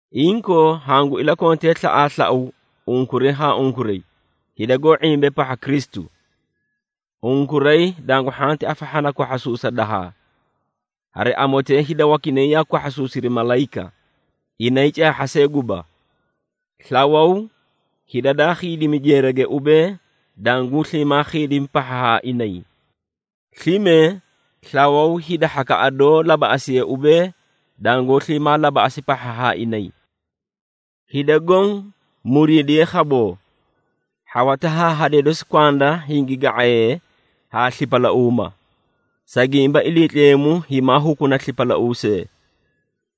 Inkoo, hangu ilakontee slaꞌaaslau unkuray haa unkuray, hida goó ⁄imbee pahha Kristu. Unkuray dangu hhanti afahhana kwahhasuusa dahaa. Hari amotee hida wakinay yaa kwahhasuusiri malayika, inay caahha see guba. Slawaw hida daa khiidimi jeerage ubee, danguu sliimaa khiidimi pahha haa inay. Slime slawaw hida hhakaꞌa doó labaꞌasiye ubee, dangoó sliimaa labaꞌasi pahha haa inay. Hida goõ muriidiyee khaboo. Hhawata haa hadee dosi kwanda hingi ga⁄ayee haa slipalauuma, sa gimba Iliitleemu himaa hukuna slipalauusee.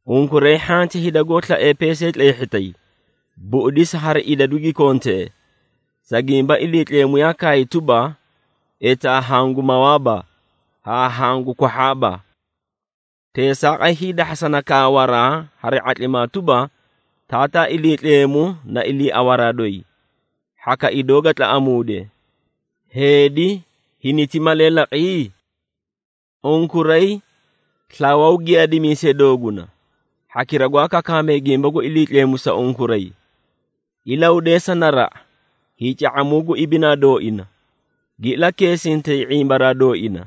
Unkuray hhanti hida goó slaee peesay tleehhitay, buꞌudisa hari idadu gi kontee, sa gimba Iliitleemu yaa kaay tuba, “Etaa hagu mawaaba, haa hagu kwahhaaba.” Teesaaqay hiidahhasana kawaraa hari ⁄atlimaa tuba, “Taataa Iliitleemu na iliiawaraa doyi, hhaka idoo ga tlaꞌamuude. Heedi hiniti malee laqi?” Unkuray slawaw giyaadimiisee dooguna, hhakira gwaa kakaamee gimba gu Iliitleemu sa unkuray. Ilahudeesa naraꞌa hiica⁄amuu gu ibinaa dooina, gi ilakeesintay ⁄imbaraa dooina.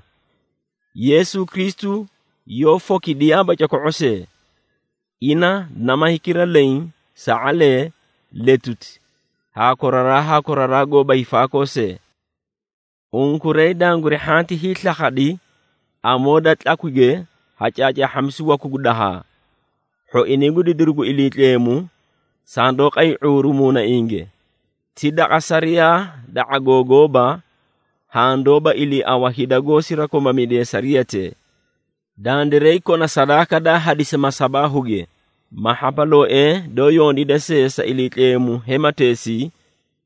Yeesu Kristu yoó fokidiyaaba coko⁄o see. Ina nama hikira leẽ, sa⁄alee, letuti haa koraraa haa koraraa goóba hiifaakoo see. Unkuray danguri hhanti hiislakhadi amoo da tlakwige ha caacaahhamisu waku gu dahaa. Hhoinay gu didiru gu Iliitleemu sandoó qay ⁄uuru muunainge, ti daqa sariyaa da ⁄agoo gooba, haã doóba iliiawa hida goó sirakomamidee sariyatee. Dandiray kona sadaaka daa hadisi masabaahuge ma hhapalooee doó yondiida see sa Iliitleemu hemateesii,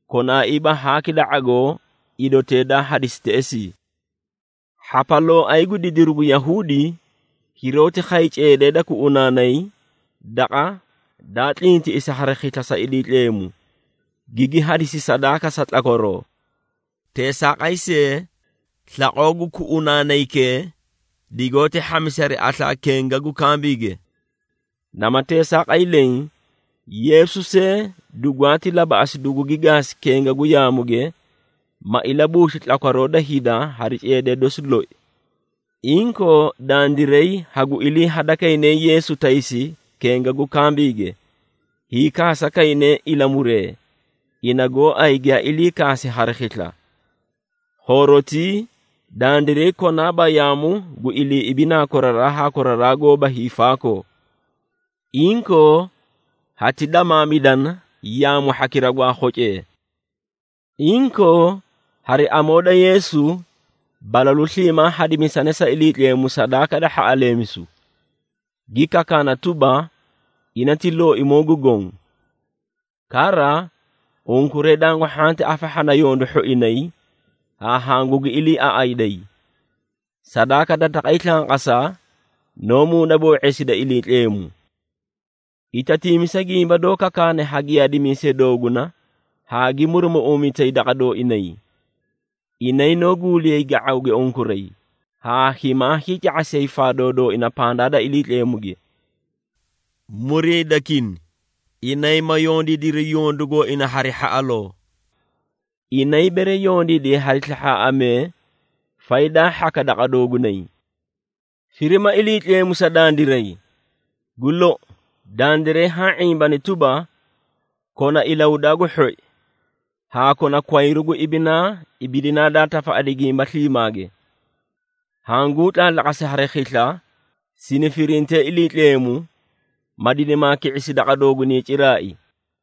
konaaiiba haaki da ⁄agoo idotee daa hadisi teꞌesii. Hhapalooay gu didiru gu Yahuudi hiroóti khay ceedee da kuꞌunaanay Daqa daa Tlintiꞌisi Hari Khisla sa Iliitleemu, gigi hadisi sadaaka sa ilamooyiru tlakwaroo. Teesaaqay see, slaqoo gu kunaanaykee digoóti hhamisi hari aslaa kenga gu kambiige. Nama teesaaqay leẽ, Yeesu see dugwaati labaꞌasi dugugi gaasi kenga gu yaamuge, ma ilabuusli tlakwaroo da hida hari ceedee dosi loi. Inkoo, dandiray hagu ilii hadakayne Yeesu taysi kenga gu kambiige, hiikaasa kayne ilamuree, ina gooay giyaa ilii kaasi hari khisla. Khoorotii dandiray konaaba yaamu gu ilii ibinaa koraraa haa koraraa goóba hiifaakoo. Inkoo, hati damaamidana yaamu hhakira gwaa khocee. Inkoo hari amoo da Yeesu, balalu sliimaa hadimisane sa Iliitleemu sadaaka da hhaꞌaleemisu, gi kakaana tuba, ina ti Looimoo gu Goõ. Kara, unkuray dangu hhanti afahhana yondu hhoinay haa hangugi iliiaꞌayday. Sadaaka da taqay slanqasa noó muunaboo⁄eesida Iliitleemu. Itatiimisa gimba doó kakaane ha giyaadimiisee dooguna haa gi murumuꞌuumitay daqa dooinay. Inay noó guuliyay ga⁄awge unkuray, haa himaa hiica⁄asiyay faadoo dooina pandaa da Iliitleemuge. Muriidakini, inay ma yondiidiri yondu gooina hari hhaꞌaloo. Inay bere yondiidiyay hari slahhaaꞌamee, faydaa hhaka daqa doogunay. Firima Iliitleemu sa dandiray. Gu lou, dandiray haã ⁄imbani tuba, kona ilahudaa gu hhoi haa kona kwayru gu ibinaa ibidinaa daa tafaꞌadi gimba sliimaage. Hanguu tlaatlaqasi hari khisla sini firintee Iliitleemu, ma dinimaa ki⁄isi daqa doogunay ciraai.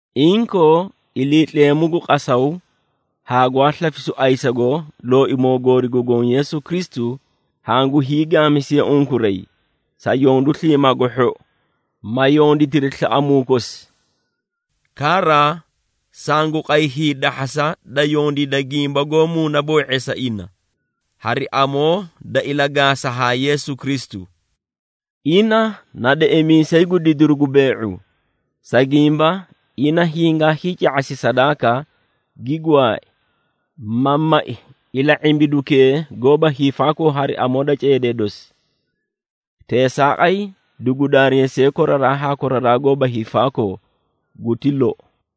Inkoo, Iliitleemu gu qasaw haa gwaa slafisu ayisago Looimoo goori gu Goõ Yeesu Kristu, hangu hiigaamisiye unkuray sa yondu sliimaa gu hhou, ma yonditiri slaꞌamuu kosi. Kara, sangu qay hiidahhasa da yondiida gimba goó muunaboo⁄eesa ina, hari amoo da ilagaasa haa Yeesu Kristu. Ina na deꞌemiisay gu didiru gu bee⁄u, sa gimba ina hingaa hiica⁄asi sadaaka, gi gwaai, ma mai ila⁄imbidukee goóba hiifaakoo hari amoo da ceedee dosi. Teesaaqay dugu daareesiye koraraa haa koraraa goóba hiifaakoo. Guti lou.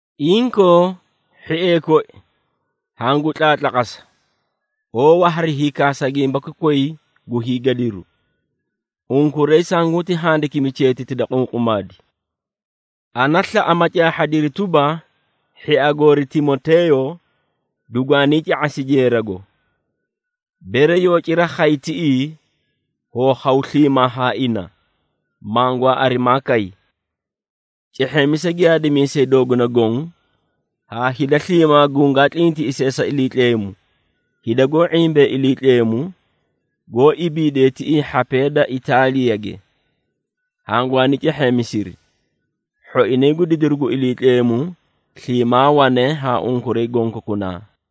Inkoo, hhiee koi, hangu tlaatlaqasa oowa hari hiikaasa gimbaki koyi gu hiigadiru. Unkuray sanguti handikimi cheetiti da qunqumaadi. Ana slaꞌa ma caahhadiri tuba, hhia goori Timoteeyo dugwaanii ca⁄asi jeerago. Bere yoo cira khay tiꞌii, hoo khaw sliimaa haa ina, mangwaa arimaa kay. Cehheemisa giyaadimiisee dooguna goõ haa hida sliimaa gungaa tlintiꞌisee sa Iliitleemu. Hida goó ⁄imbee Iliitleemu, goó ibiidee tiꞌii hhapee da Itaaliyage hangwaani cehheemisiri. Hhoinay gu didiru gu Iliitleemu sliimaa wane haa unkuray gonkokunaa.